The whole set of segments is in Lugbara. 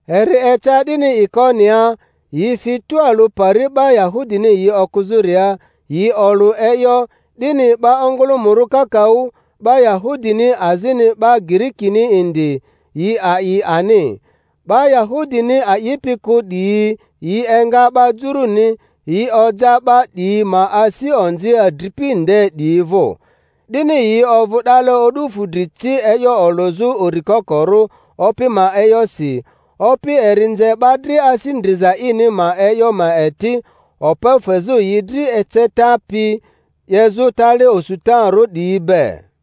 Eri eca 'dini Ikoniaa, yi fi tualᴜ pari 'ba Yahudini yi okᴜzᴜria, yi olᴜ e'yo, 'dini 'ba ongᴜlᴜmᴜrᴜ kakaᴜ, 'ba Yahudini azini 'ba Girikini indi, yi a'i ani. 'Ba Yahudini a'ipi kᴜ 'diyi yi enga 'ba Juruni, yi oja 'ba 'diyi ma asi onzi adripi nde 'diyi vᴜ. 'Dini yi ovᴜ 'dale o'du fudri ci e'yo olᴜzᴜ uri kokorᴜ Opi ma e'yosi; Opi eri nze 'ba dri asi ndriza ini ma e'yo ma eti, okpo fezᴜ yi dri eceta pi 'yezᴜ tali osutarᴜ 'diyi be.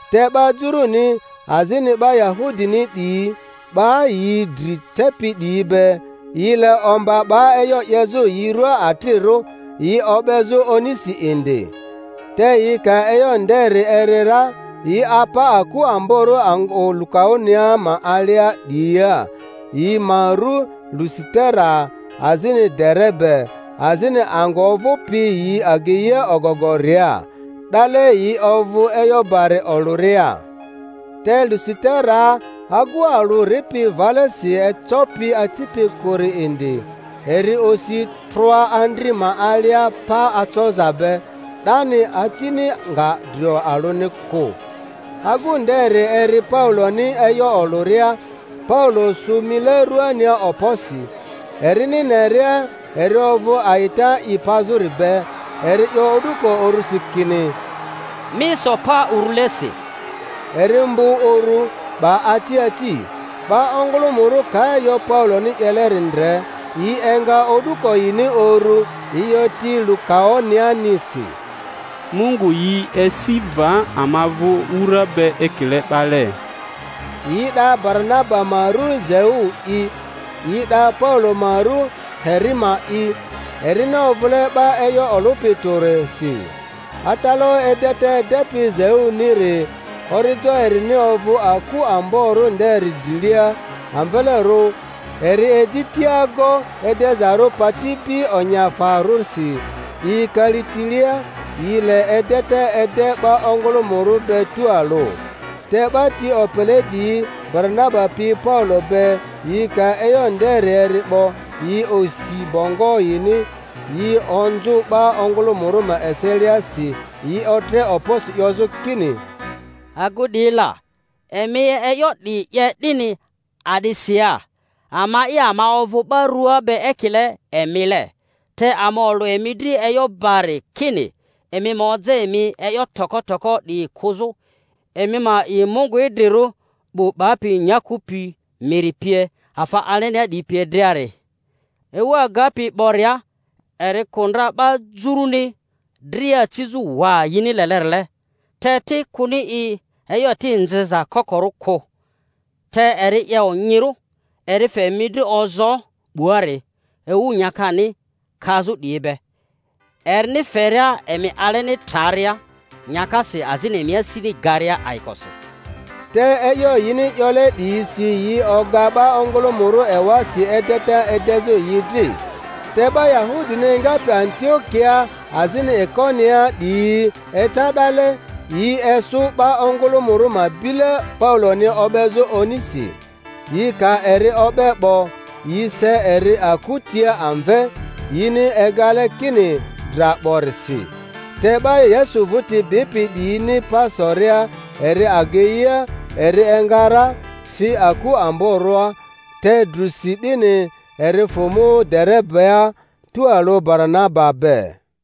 Te 'ba Juruni azini 'ba Yahudini 'diyi, 'ba yi dri cepi 'diyi be, yi le omba 'ba e'yo 'yezᴜ yi ruaa atrirᴜ, yi o'bezᴜ onisi indi. Te yi ka e'yo nderi eri ra, yi apa aku amborᴜ angᴜ Lukaonia ma alia 'diyia, yi ma ru Lusitera azini Derebe, azini angᴜ ovᴜpi yi ageia ogogoria; 'dale yi ovᴜ e'yo bari olᴜria. Te Lusiteraa agu alᴜ ripi valesi ecopi acipi kᴜri indi; eri osi trᴜa andri ma alia pa acoza be 'dani, acini nga drio alᴜni kᴜ. Agu nderi eri Pauloni e'yo olᴜria; Paulo sᴜ mile ruania okposi, erini neria eri ovᴜ a'ita i pazᴜri be, eri 'yo o'duko urᴜsi kini, Mi so pa urulesi. Eri mbᴜ uru, 'ba aci aci. 'Ba ongᴜlᴜmᴜrᴜ ka e'yo Pauloni 'yeleri ndre, yi enga o'duko yini urᴜ, yi 'yo ti Lukaonianisi, Mungu yi esi va ama vᴜ wura be ekile 'bale! Yi 'da Baranaba ma ru Zeu'i, yi 'da Paulo ma rᴜ Herima'i, erini ovᴜle 'ba e'yo olᴜpi tᴜrisi. Atalaᴜ edeta edepi Zeuniri, orijo erini ovᴜ aku amborᴜ nderi drilia amvelerᴜ, eri eji tiago edezarᴜ patibi onyiafarᴜsi 'diyi kalitilea, yi le edeta ede 'ba ongᴜlᴜmᴜrᴜ be tualᴜ. Te 'ba ti opele 'diyi Baranaba pi Paulo be, yi ka e'yo nderi eri 'bo, yi osi bongo yini, yi onzᴜ 'ba ongᴜlᴜmᴜrᴜ ma eseliasi, yi otre okposi 'yozᴜ kini, Agu 'diyi la! Emi e'yo 'diyi 'ye 'dini a'disi ya? Ama'i ama ovᴜ 'ba rua be ekile emile, te ama olᴜ emi dri e'yo bari kini emi ma oja emi e'yo toko toko 'diyi kᴜzᴜ, emi ma a'i Mungu idrirᴜ 'bu 'bapi nyaku pi, miri pie, afa alenia 'diyi pie driari. Ewu agapi 'boria, eri kᴜ ndra 'ba Juruni dria acizᴜ waa yini lelerile; te ti, kᴜni i e'yo eti nzeza kokorᴜ kᴜ, te eri 'ye onyirᴜ, eri fe emi dri ozoo 'buari, ewu nyakani kazᴜ 'diyi be, erini feria emi aleni traria nyakasi azini emi asini garia ayikosi. Te e'yo yini 'yole 'diyisi yi oga 'ba ongᴜlᴜmᴜrᴜ ewasi edeta edezᴜ yi dri. Te 'ba Yahudini engapi Antio-kiaa azini Ikoniaa 'diyi eca 'dale; yi esᴜ 'ba ongᴜlᴜmᴜrᴜ ma bile Pauloni o'bezᴜ onisi. Yi ka eri o'be 'bo, yi se eri aku tia amve, yini egale kini dra 'borisi. Te 'ba Yesu vᴜti bipi 'diyini pa soria eri ageia, eri enga ra, fi aku amborᴜa; te drᴜsi 'dini, eri fᴜ mu Derebea tualᴜ Baranaba be.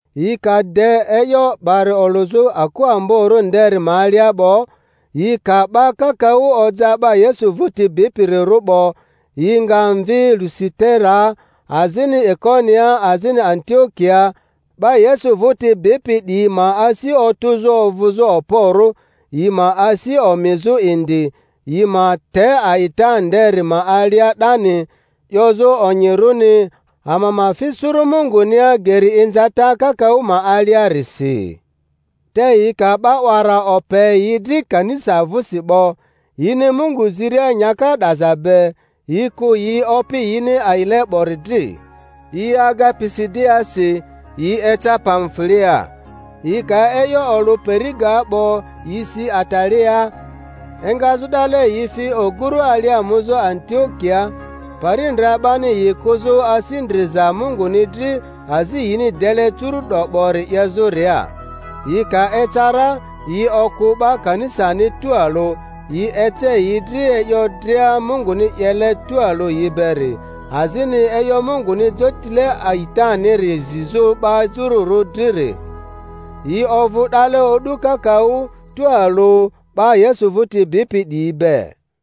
Yi ka de e'yo bari olᴜzᴜ aku amborᴜ nderi ma alia 'bo, yi ka 'ba kakaᴜ oja 'ba Yesu vᴜti bipirirᴜ 'bo, yi nga mvi Lusiteraa azini Ikoniaa azini Antiokiaa, 'ba Yesu vᴜti bipi 'diyi ma asi otᴜzᴜ ovᴜzᴜ okporᴜ, yi ma asi omizᴜ indi yi ma te a'ita nderi ma alia 'dani, 'yozᴜ onyirᴜni ama ma fi suru Mungunia geri inzata kakaᴜ ma aliarisi. Te yi ka 'ba 'wara ope yi dri kanisa vᴜsi 'bo, yini Mungu ziria nyaka 'daza be, yi kᴜ yi Opi yini a'ile 'bori dri. Yi aga Pisidiaasi, yi eca Pamfuliaa. Yi ka e'yo olᴜ Peri-gaa 'bo, yi si Ataliaa; engazᴜ 'dale yi fi oguru alia muzᴜ Antiokiaa, pari ndra 'bani yi kᴜzᴜ asi ndriza Munguni dri azi yini dele curu'do 'bori 'yezᴜria. Yi ka eca ra, yi okᴜ 'ba kanisani tualᴜ, yi ece yi dri e'yo dria Munguni 'yele tualᴜ yi beri, azini e'yo Munguni jotile a'itaniri zizᴜ 'ba Jururᴜ driri. Yi ovᴜ 'dale o'du kakaᴜ tualᴜ 'ba Yesu vᴜti bipi 'diyi be.